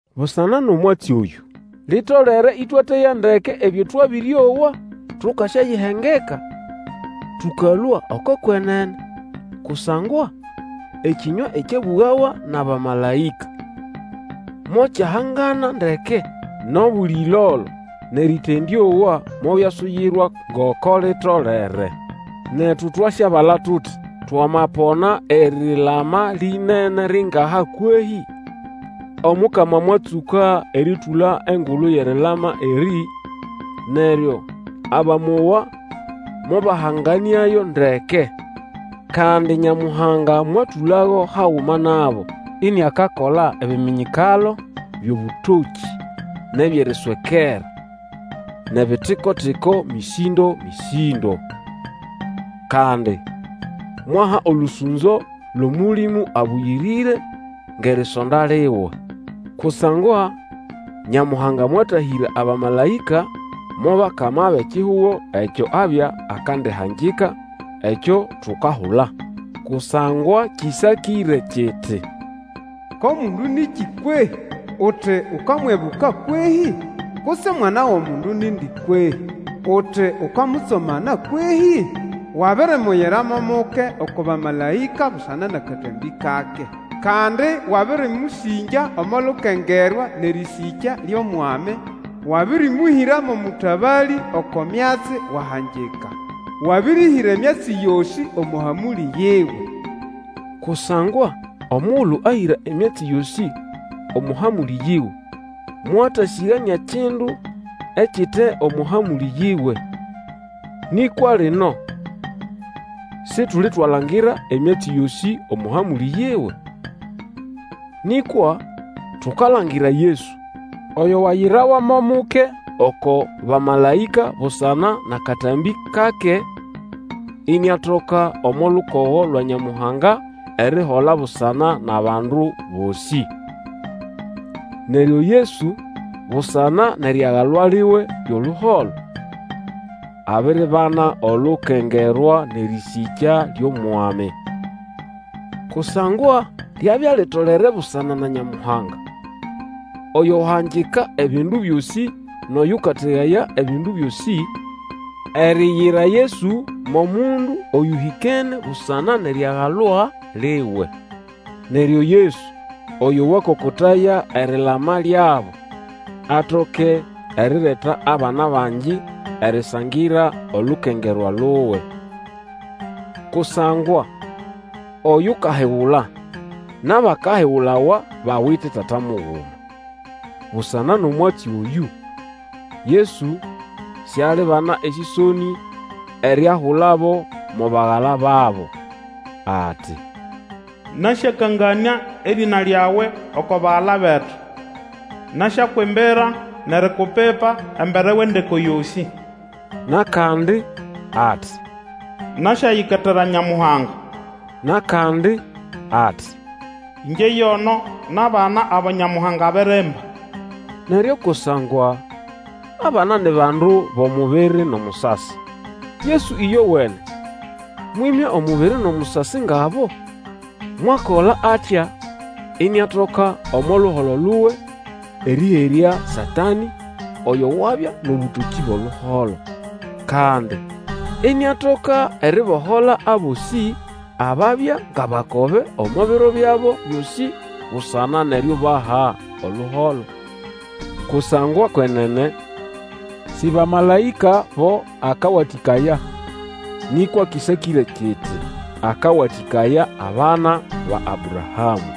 Busana nʼomwatsi oyũ, litolere ĩtwateya ndeke ebyo twabĩrĩowa, tukasyayihengeka, tũkalũa oko kwenene. Kusangwa ekĩnywa ekyabũgawa nʼabamalaĩka mokyahangana ndeke, nʼobuli ĩlolo nʼerĩtendĩowa mobyasuyirwa ngoko litolere. Netu twasyabala tuti twamapona erilama linene ringaha kwehĩ? Omukama mwatsũka erĩtũla engulu yʼerilama erĩ, neryo abamowa mobahanganĩayo ndeke. Kandi Nyamuhanga mwatũlago haguma nabo iniakakola ebiminyikalo, byʼobũtokĩ, nʼebyʼeriswekera, nʼebitiko-tiko mĩsĩndomĩsĩndo. Kandi mwaha olũsũnzo lwʼOmũlĩmũ Abũyĩrĩre ngʼerisonda liwe. Kusangwa Nyamuhanga mwatahĩra abamalaĩka mo bakama bʼekihugo ekyo abya akandihangika, ekyo tukahula. Kusangwa kĩsakĩre kiti, Ko mundu nĩkĩ kwehĩ? uti ukamwibuka kwehĩ? Kutse omwana wʼomundu nindi kwehĩ? uti ukamutsomana kwehĩ? Wabirimuyira mo muke oko bamalaĩka busana nʼakatambĩ kake; Kandi wabĩrĩmũsĩngya omo lukengerwa nʼerĩsĩkya lyʼOmwami, Wabĩrĩmũhĩra mo mũtabalĩ oko myatsi wahangika, Wabĩrĩhĩra emyatsi yosĩ omo hamũlĩ yiwe. Kusangwa omugulu ahĩra emyatsi yosĩ omo hamũlĩ yiwe, mwatasĩganĩa kindu ekite omo hamũlĩ yiwe. Nĩkwa lino situlitwalangira emyatsi yosĩ omo hamũlĩ yiwe. Nĩkwa tukalangira Yesu, oyo wayirawa mo muke oko bamalaĩka busana nʼakatambĩ kake, iniatoka omo lukogo lwa Nyamuhanga erihola busana nʼabandu bosĩ. Neryo Yesu busana nʼeriagalwa liwe lyʼoluholo, abiribana olukengerwa nʼerĩsĩkya lyʼOmwami. Kusangwa lyabya litolere busana na Nyamuhanga, oyo wahangika ebindu byosĩ nʼoyũkategaya ebindu byosĩ, eriyira Yesu mo mundu oyũhĩkene busana nʼeriagalwa liwe. Neryo Yesu oyo wakokotaya erilama lyabo, atoke erireta abana bangi erisangira olukengerwa luwe. Kusangwa oyukahigula nʼabakahigulawa bawite Tata muguma; busana nʼomwatsi oyũ, Yesu sialibana esĩsonĩ eriahulabo mo bagala babo, ati, Nasyakanganĩa erĩna lyawe oko bagala betu, Nasyakwimbira nʼerikupipa embere wʼendeko yosĩ. Nʼakandi ati, Nasyayiketera Nyamuhanga. Nʼakandi ati, Ĩngye yono nʼabana abo Nyamuhanga abirimba. Neryo kusangwa abana ni bandu bʼomubiri nʼomusasi, Yesu ĩyowene mwĩmya omubiri nʼomusasi ngʼabo. Mwakola atya iniatoka omo luholo luwe erĩherya Satanĩ oyo wabya nʼobũtokĩ bwʼoluholo. Kandi iniatoka eribohola abosĩ ababya ngʼabakobe omo biro byabo byosĩ busana nʼeriubaha oluholo. Kusangwa kwenene si bamalaĩka bo akawatĩkaya, nĩkwa kĩsakĩre kiti, Akawatĩkaya abana ba Abrahamũ.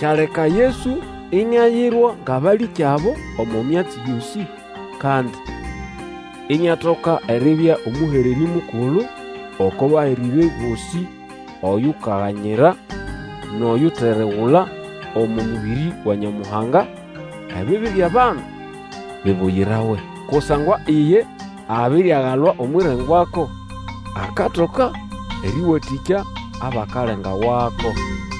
Kyaleka Yesu iniayirwa ngʼabalĩkyabo omo myatsi yosĩ, kandi iniatoka eribya omũhererĩ mukulu oko bahererĩ bosĩ oyukaganyira, nʼoyuteregula omo mũbĩrĩ wa Nyamuhanga, ebibi byʼabandu bibuyirawe. Kusangwa iye abiriagalwa omwʼirengwako, akatoka erĩwatĩkya abakalenga wako.